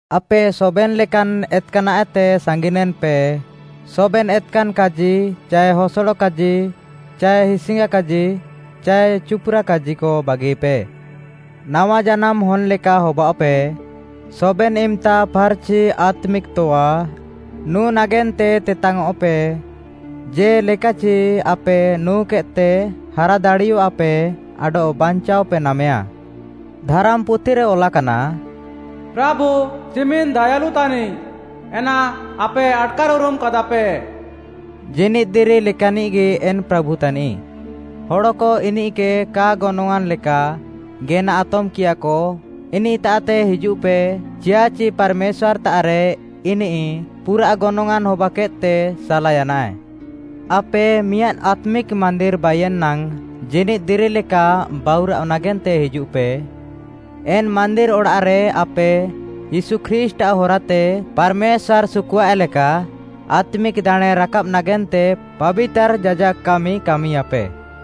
ଆପେ ସବେନ୍‌ ଲେକାନ୍‌ ଏତ୍‌କାନାଃଏତେ ସାଙ୍ଗିନେନ୍‌ପେ। ସବେନ୍‌ ଏତ୍‌କାନ୍‌ କାଜି ଚାଏ ହସଡ଼ କାଜି ଚାଏ ହିସ୍‌ଙ୍ଗା କାଜି ଚାଏ ଚୁପ୍‌ରା କାଜିକ ବାଗିପେ। ନାୱାଜାନାମ୍‌ ହନ୍‌ଲେକା ହବାଅଃପେ। ସବେନ୍‌ ଇମ୍‌ତା ଫାର୍‌ଚି ଆତ୍ମିକ୍‌ ତଆ ନୁଁ ନାଗେନ୍ତେ ତେତାଙ୍ଗ୍‌ଅଃପେ, ଜେ'ଲେକାଚି ଆପେ ନୁଁକେଦ୍‌ତେ ହାରା ଦାଡ଼ିୟଃଆପେ ଆଡଃ ବାଞ୍ଚାଅପେ ନାମେୟା। ଧାରାମ୍‌ପୁଥିରେ ଅଲାକାନା, “ପ୍ରାଭୁ ଚିମିନ୍‌ ଦାୟାଳୁ ତାନିଃ, ଏନା ଆପେ ଆଟ୍‌କାର୍‌ଉରୁମ୍‌ କାଦାପେ।” ଜୀନିଦ୍‌ ଦିରି ଲେକାନ୍‌ନିଃଗି ଏନ୍‌ ପ୍ରାଭୁ ତାନିଃ, ହଡ଼କ ଇନିଃକେ କା ଗନଙ୍ଗ୍‌ଆଁନ୍‌ ଲେକା ଗେନା ଆତମ୍‌କିୟାକ, ଇନିଃତାଃତେ ହିଜୁଃପେ, ଚିୟାଃଚି ପାର୍‌ମେଶ୍ୱାର୍‌ତାଃରେ ଇନିଃ ପୁରାଃ ଗନଙ୍ଗ୍‌ଆଁନ୍‌ ହବାକେଦ୍‌ତେ ସାଲାୟାନାଏ। ଆପେ ମିଆଁଦ୍‌ ଆତ୍ମିକ୍‌ ମାନ୍ଦିର୍‌ ବାଇୟେନ୍‌ ନାଙ୍ଗ୍‌ ଜୀନିଦ୍‌ ଦିରି ଲେକା ବାଉରାଅଃ ନାଗେନ୍ତେ ହିଜୁଃପେ। ଏନ୍‌ ମାନ୍ଦିର୍‌ ଅଡ଼ାଃରେ ଆପେ ୟୀଶୁ ଖ୍ରୀଷ୍ଟ୍‌ଆଃ ହରାତେ ପାର୍‌ମେଶ୍ୱାର୍‌ ସୁକୁଃଆଏ ଲେକା ଆତ୍ମିକ୍‌ ଦାଣେଁ ରାକାବ୍‌ ନାଗେନ୍ତେ ପାବିତାର୍‌ ଯାଜାକ୍‌ କାମି କାମିୟାପେ।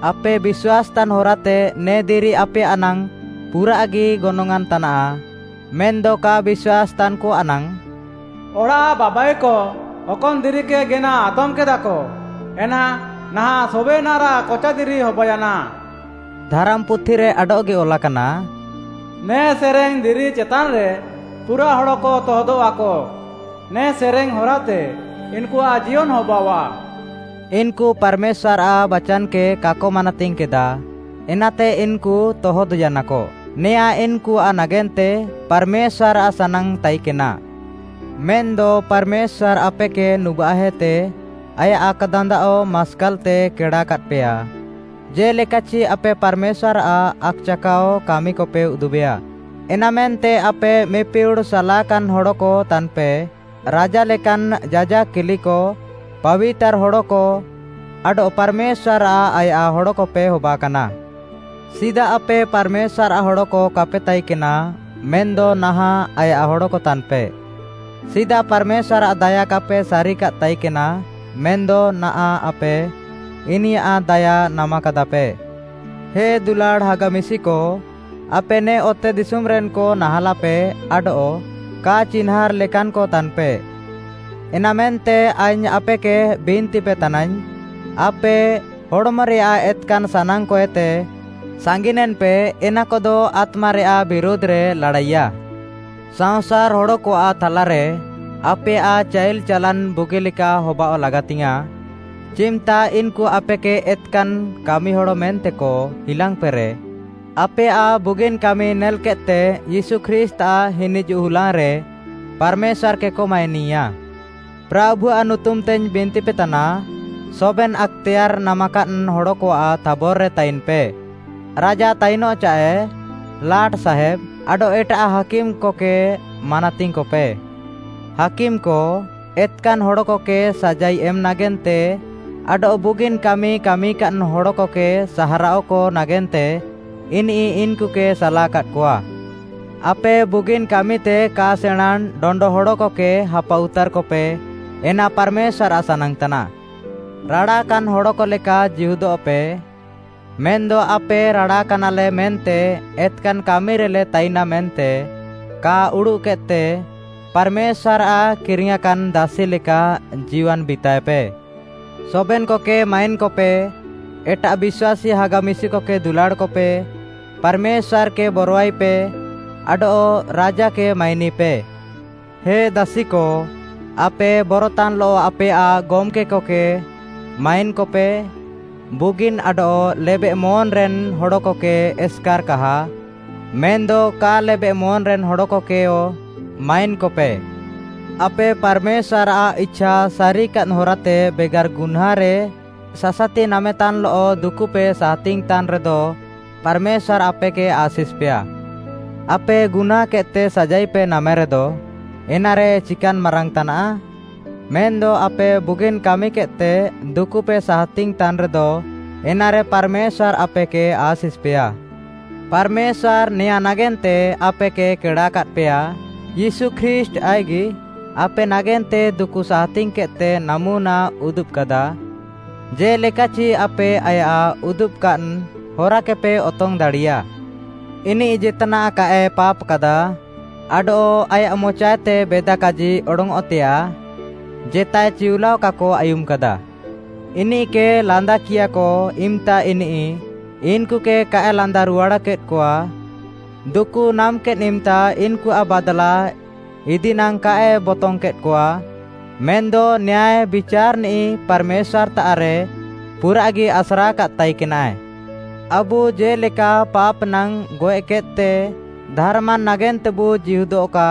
ଆପେ ବିଶ୍ୱାସ୍‌ତାନ୍‌ ହରାତେ ନେ ଦିରି ଆପେୟାଃ ନାଙ୍ଗ୍‌ ପୁରାଃଗି ଗନଙ୍ଗ୍‌ଆଁନ୍‌ ତାନାଃ। ମେନ୍‌ଦ କା ବିଶ୍ୱାସ୍‌ତାନ୍‌କଆଃ ନାଙ୍ଗ୍‌, “ଅଡ଼ାଃ ବାବାଇକ ଅକନ୍‌ ଦିରିକେ ଗେନା ଆତମ୍‌କେଦାକ, ଏନା ନାହାଁଃ ସବେନାଃରାଃ କଚା ଦିରି ହବାୟାନା।” ଧାରାମ୍‌ପୁଥିରେ ଆଡଃଗି ଅଲାକାନା, “ନେ ସେରେଙ୍ଗ୍‌ ଦିରି ଚେତାନ୍‌ରେ ପୁରାଃ ହଡ଼କ ତହଦଃଆକ, ନେ ସେରେଙ୍ଗ୍‌ ହରାତେ ଇନ୍‌କୁଆଃ ଜିୟନ୍‌ ହବାଅଃଆ।” ଇନ୍‌କୁ ପାର୍‌ମେଶ୍ୱାର୍‌ଆଃ ବାଚାନ୍‌କେ କାକ ମାନାତିଙ୍ଗ୍‌କେଦା, ଏନାତେ ଇନ୍‌କୁ ତହଦ୍‌ୟାନାକ। ନେଆଁଁ ଇନ୍‌କୁଆଃ ନାଗେନ୍ତେ ପାର୍‌ମେଶ୍ୱାର୍‌ଆଃ ସାନାଙ୍ଗ୍‌ ତାଇକେନା। ମେନ୍‌ଦ ପାର୍‌ମେଶ୍ୱାର୍‌ ଆପେକେ ନୁବାଃହେତେ ଆୟାଃ ଆକ୍‌ଦାନ୍ଦାଅ ମାସ୍କାଲ୍‌ତେ କେଡ଼ାକାଦ୍‌ପେୟା, ଜେ'ଲେକାଚି ଆପେ ପାର୍‌ମେଶ୍ୱାର୍‌ଆଃ ଆକ୍‌ଚାକାଅ କାମିକପେ ଉଦୁବେଆ, ଏନାମେନ୍ତେ ଆପେ ମିପିହୁଡ଼୍‌ ସାଲାକାନ୍‌ ହଡ଼କ ତାନ୍‌ପେ, ରାଜା ଲେକାନ୍‌ ଯାଜାକ୍‌ କିଲିକ, ପାବିତାର୍‌ ହଡ଼କ, ଆଡଃ ପାର୍‌ମେଶ୍ୱାର୍‌ଆଃ ଆୟାଃ ହଡ଼କପେ ହବାକାନା। ସିଦା ଆପେ ପାର୍‌ମେଶ୍ୱାର୍‌ଆଃ ହଡ଼କ କାପେ ତାଇକେନା, ମେନ୍‌ଦ ନାହାଁଃ ଆୟାଃ ହଡ଼କ ତାନ୍‌ପେ। ସିଦା ପାର୍‌ମେଶ୍ୱାର୍‌ଆଃ ଦାୟା କାପେ ସାରିକାଦ୍‌ ତାଇକେନା, ମେନ୍‌ଦ ନାହାଁଃ ଆପେ ଇନିୟାଃ ଦାୟା ନାମାକାଦାପେ। ହେ ଦୁଲାଡ଼୍‌ ହାଗା ମିଶିକ, ଆପେ ନେ ଅତେଦିଶୁମ୍‌ରେନ୍‌କ ନାହାଁଲାପେ ଆଡଃ କା ଚିହ୍ନାଁର୍‌ ଲେକାନ୍‌କ ତାନ୍‌ପେ, ଏନାମେନ୍ତେ ଆଇଙ୍ଗ୍‌ ଆପେକେ ବିନ୍ତିପେ ତାନାଇଙ୍ଗ୍‌, ଆପେ ହଡ଼୍‌ମରେୟାଃ ଏତ୍‌କାନ୍‌ ସାନାଙ୍ଗ୍‌କଏତେ ସାଙ୍ଗିନେନ୍‌ପେ, ଏନାକଦ ଆତ୍ମାରେୟାଃ ବିରୁଧ୍‌ରେ ଲାଡ଼ାଇୟାଃ। ସାଅଁସାର୍‌ ହଡ଼କଆଃ ଥାଲାରେ ଆପେୟାଃ ଚାଇଲ୍‌ ଚାଲାନ୍‌ ବୁଗିଲେକା ହବାଅଃ ଲାଗାତିୟାଁ, ଚିମ୍‌ତା ଇନ୍‌କୁ ଆପେକେ ଏତ୍‌କାନ୍‌ କାମିହଡ଼ ମେନ୍ତେକ ହିଲାଙ୍ଗ୍‌ପେରେ, ଆପେୟାଃ ବୁଗିନ୍‌ କାମି ନେଲ୍‌କେଦ୍‌ତେ ୟୀଶୁ ଖ୍ରୀଷ୍ଟ୍‌ଆଃ ହିନିଜୁଃ ହୁଲାଙ୍ଗ୍‌ରେ ପାର୍‌ମେଶ୍ୱାର୍‌କେକ ମାଇନିୟା। ପ୍ରାଭୁଆଃ ନୁତୁମ୍‌ତେଇଙ୍ଗ୍‌ ବିନ୍ତିପେ ତାନା, ସବେନ୍‌ ଆକ୍‌ତେୟାର୍‌ ନାମାକାଦ୍‌ ହଡ଼କଆଃ ଥାବର୍‌ରେ ତାଇନ୍‌ପେ। ରାଜା ତାଇନଃ ଚାଏ, ଲାଟ୍‌ସାହେବ୍‌, ଆଡଃ ଏଟାଃ ହାକିମ୍‌କକେ ମାନାତିଙ୍ଗ୍‌କପେ। ହାକିମ୍‌କ, ଏତ୍‌କାନ୍‌ ହଡ଼କକେ ସାଜାଇ ଏମ୍‌ ନାଗେନ୍ତେ ଆଡଃ ବୁଗିନ୍‌ କାମି କାମିକାଦ୍‌ ହଡ଼କକେ ସାହାରାଅକ ନାଗେନ୍ତେ ଇନିଃ ଇନ୍‌କୁକେ ସାଲାକାଦ୍‌କଆ। ଆପେ ବୁଗିନ୍‌ କାମିତେ କା ସେଣାଁଁନ୍‌ ଡଣ୍ଡ ହଡ଼କକେ ହାପାଉତାର୍‌କପେ, ଏନା ପାର୍‌ମେଶ୍ୱାର୍‌ଆଃ ସାନାଙ୍ଗ୍‌ ତାନାଃ। ରାଡ଼ାକାନ୍‌ ହଡ଼କ ଲେକା ଜୀହୁଦଃପେ, ମେନ୍‌ଦ ଆପେ ରାଡ଼ାକାନାଲେ ମେନ୍ତେ ଏତ୍‌କାନ୍‌ କାମିରେଲେ ତାଇନା ମେନ୍ତେ କା ଉଡ଼ୁଃକେଦ୍‌ତେ, ପାର୍‌ମେଶ୍ୱାର୍‌ଆଃ କିରିଙ୍ଗ୍‌ୟାଁକାନ୍‌ ଦାସି ଲେକା ଜୀୱାନ୍‌ ବିତାଏପେ। ସବେନ୍‌କକେ ମାଇନ୍‌କପେ, ଏଟାଃ ବିଶ୍ୱାସୀ ହାଗା ମିଶିକକେ ଦୁଲାଡ଼୍‌କପେ, ପାର୍‌ମେଶ୍ୱାର୍‌କେ ବରଆଇପେ, ଆଡଃ ରାଜାକେ ମାଇନିପେ। ହେ ଦାସିକ, ଆପେ ବରତାନ୍‌ଲଃ ଆପେୟାଃ ଗମ୍‌କେକକେ ମାଇନ୍‌କପେ, ବୁଗିନ୍‌ ଆଡଃ ଲେବେଃମନ୍‌ରେନ୍‌ ହଡ଼କକେ ଏସ୍‌କାର୍‌ କାହା, ମେନ୍‌ଦ କା ଲେବେଃମନ୍‌ରେନ୍‌ ହଡ଼କକେହ ମାଇନ୍‌କପେ। ଆପେ ପାର୍‌ମେଶ୍ୱାର୍‌ଆଃ ଇଛା ସାରିକାଦ୍‌ ହରାତେ ବେଗାର୍‌ ଗୁହ୍ନାଁଁରେ ସାସାତି ନାମେତାନ୍‌ଲଃ ଦୁକୁପେ ସାହାତିଙ୍ଗ୍‌ ତାନ୍‌ରେଦ, ପାର୍‌ମେଶ୍ୱାର୍‌ ଆପେକେ ଆଶିଷ୍‌ପେୟା। ଆପେ ଗୁହ୍ନାଁଁକେଦ୍‌ତେ ସାଜାଇପେ ନାମେରେଦ, ଏନାରେ ଚିକାନ୍‌ ମାରାଙ୍ଗ୍‌ ତାନାଃ? ମେନ୍‌ଦ ଆପେ ବୁଗିନ୍‌ କାମିକେଦ୍‌ତେ ଦୁକୁପେ ସାହାତିଙ୍ଗ୍‌ ତାନ୍‌ରେଦ, ଏନାରେ ପାର୍‌ମେଶ୍ୱାର୍‌ ଆପେକେ ଆଶିଷ୍‌ପେୟା। ପାର୍‌ମେଶ୍ୱାର୍‌ ନେଆଁଁ ନାଗେନ୍ତେ ଆପେକେ କେଡ଼ାକାଦ୍‌ପେୟା। ୟୀଶୁ ଖ୍ରୀଷ୍ଟ୍‌ ଆଇଃକ୍‌ଗି ଆପେ ନାଗେନ୍ତେ ଦୁକୁ ସାହାତିଙ୍ଗ୍‌କେଦ୍‌ତେ ନାମୁନା ଉଦୁବ୍‌କାଦା, ଜେ'ଲେକାଚି ଆପେ ଆୟାଃ ଉଦୁବାକାଦ୍‌ ହରାକେପେ ଅତଙ୍ଗ୍‌ ଦାଡ଼ିୟା। ଇନିଃ ଜେତ୍‌ନାଃ କାଏ ପାପ୍‌କାଦା, ଆଡଃ ଆୟାଃ ମଚାଏତେ ବେଦା କାଜି ଅଡଙ୍ଗ୍‌ଅଃତେୟାଃ ଜେତାଏ ଚିଉଲାଅ କାକ ଆୟୁମ୍‌କାଦା। ଇନିଃକେ ଲାନ୍ଦାକିୟାକ ଇମ୍‌ତା ଇନିଃ ଇନ୍‌କୁକେ କାଏ ଲାନ୍ଦାରୁହାଡ଼୍‌କେଦ୍‌କଆ, ଦୁକୁ ନାମ୍‌କେଦ୍‌ ଇମ୍‌ତା ଇନ୍‌କୁଆଃ ବାଦ୍‌ଲା ଇଦିନାଙ୍ଗ୍‌ କାଏ ବତଙ୍ଗ୍‌କେଦ୍‌କଆ, ମେନ୍‌ଦ ନ୍ୟାୟ ବିଚାର୍‌ନିଃ ପାର୍‌ମେଶ୍ୱାର୍‌ତାଃରେ ପୁରାଃଗି ଆସ୍ରାକାଦ୍‌ ତାଇକେନାଏ। ଆବୁ ଜେ'ଲେକା ପାପ୍‌ ନାଙ୍ଗ୍‌ ଗଏଃକେଦ୍‌ତେ, ଧାର୍‌ମାନ୍‌ ନାଗେନ୍ତେବୁ ଜୀହୁଦଃକା,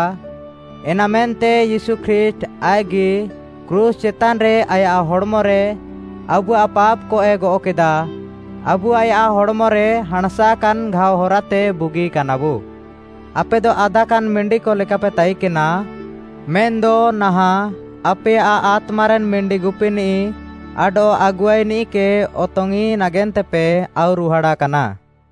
ଏନାମେନ୍ତେ ୟୀଶୁ ଖ୍ରୀଷ୍ଟ୍‌ ଆଇଃକ୍‌ଗି କ୍ରୁଶ୍‌ ଚେତାନ୍‌ରେ ଆୟାଃ ହଡ଼୍‌ମରେ ଆବୁଆଃ ପାପ୍‌କଏ ଗଅଃକେଦା। ଆବୁ ଆୟାଃ ହଡ଼୍‌ମରେ ହାଁଣ୍‌ସାକାନ୍‌ ଘାଅ ହରାତେ ବୁଗିକାନାବୁ। ଆପେଦ ଆଦାକାନ୍‌ ମିଣ୍ଡିକ ଲେକାପେ ତାଇକେନା, ମେନ୍‌ଦ ନାହାଁଃ ଆପେୟାଃ ଆତ୍ମାରେନ୍‌ ମିଣ୍ଡିଗୁପିନିଃ ଆଡଃ ଆଗୁଆଇନିଃକେ ଅତଙ୍ଗ୍‌ଇଁ ନାଗେନ୍ତେପେ ଆଉରୁହାଡ଼ାକାନା।